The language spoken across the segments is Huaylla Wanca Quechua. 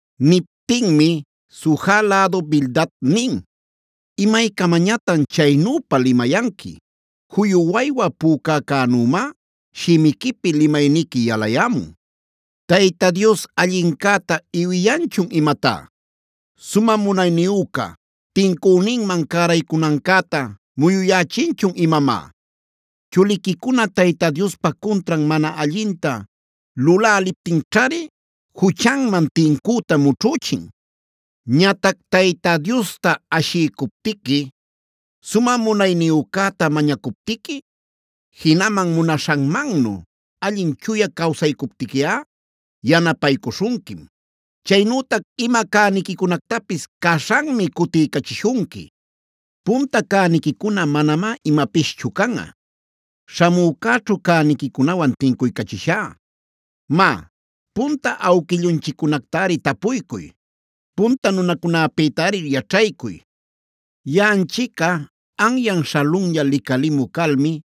Niptinmi Suja lädu Bildad nin: “¿Imaycamañatan chaynüpa limayanqui? Juyu waywa pücäcänümá shimiquipi limayniqui yalayämun. ¿¡Tayta Dios allincäta iwiyanchun imatá!? Sumä munayniyüca, ¿¡tincüninman cäraycunancäta muyuyächinchun imamá!? Chuliquicuna Tayta Diospa cuntran mana allinta luläläliptinćhari juchanman tincüta mućhüchin. Ñatac Tayta Diosta ashiycuptiqui, sumä munayniyücäta mañacuptiqui, jinaman munaśhanmannu allin chuya cawsaycuptiquiꞌa, yanapaycuśhunquim; chaynütac ima cäniquicunactapis caśhanmi cutiycachishunqui. Punta cäniquicuna manamá imapischu canꞌa, śhamücäćhu cäniquicunawan tincuycachishá. “Má, punta awquillunchiccunactari tapuycuy; punta nunacunäpïtari yaćhaycuy. Yaꞌanchicꞌa anyan śhalunlla licalimü calmi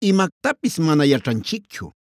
imactapis mana yaćhanchicchu.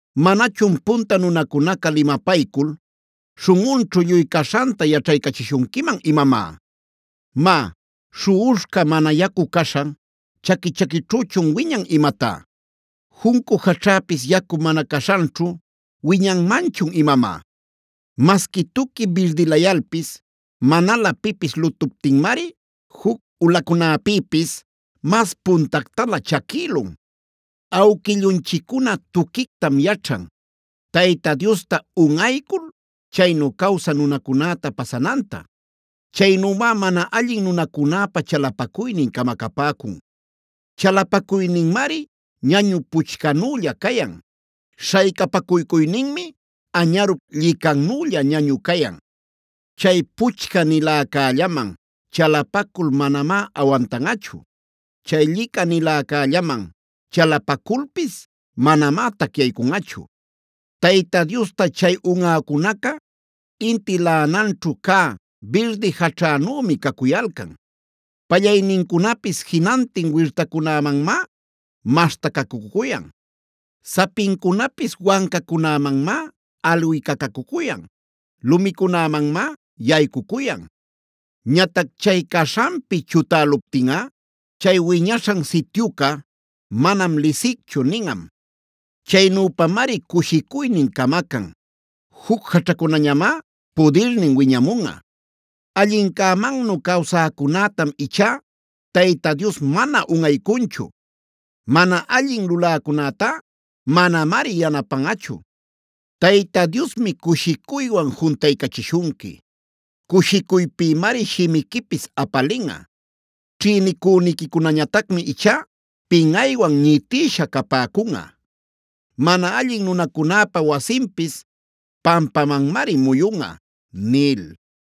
¿Manachun punta nunacunaca limapaycul, śhunꞌunćhu lluy caśhanta yaćhaycachishunquiman imamá? “Má, ¿śhuꞌuśhca mana yacu caśhan, chaqui-chaquićhüchun wiñan imatá? ¿Juncu jaćhäpis yacu mana caśhanćhu wiñanmanchun imamá? Masqui tuqui birdilayalpis manalä pipis lutuptinmari juc ulacunäpïpis mas puntactalä chaquïlun. Awquillunchiccuna tuquictam yaćhan, Tayta Diosta unꞌaycul chaynu cawsä nunacunäta pasananta. Chaynümá mana allin nunacunäpa chalapacuynin camacapäcun. Chalapacuyninmari ñañu puchcänülla cayan. Śhaycapacuycuyninmi añärup llicannülla ñañu cayan. Chay puchca-niläcällaman chalapacul manamá awantanꞌachu. Chay llicaniläcällaman chalapaculpis manamá tacyaycunꞌachu. Tayta Diosta chay unꞌäcunaca inti laꞌananćhu cä birdi jaćhänümi cacuyalcan. Pallaynincunapis jinantin wirtacunämanmá maśhtacacucuyan. Sapincunapis wancacunämanmá alwicacacuyan, lumicunämanmá yaycucuyan. Ñatac chay caśhanpi chutäluptinꞌa chay wiñaśhan sityuca: ‘Manam lisicchu’ ninꞌam. Chaynüpamari cushicuynin camacan. Juc jaćhacunañamá pudirnin wiñamunꞌa. “Allincämannu cawsäcunätam ichá Tayta Dios mana unꞌaycunchu. Mana allin luläcunätá manamari yanapanꞌachu. Tayta Diosmi cushicuywan juntaycachishunqui; cushicuypïmari shimiquipis apalinꞌa. Ćhïnicüniquicunañatacmi ichá pinꞌaywan ñitïsha capäcunꞌa; mana allin nunacunäpa wasinpis pampamanmari muyunꞌa” nil.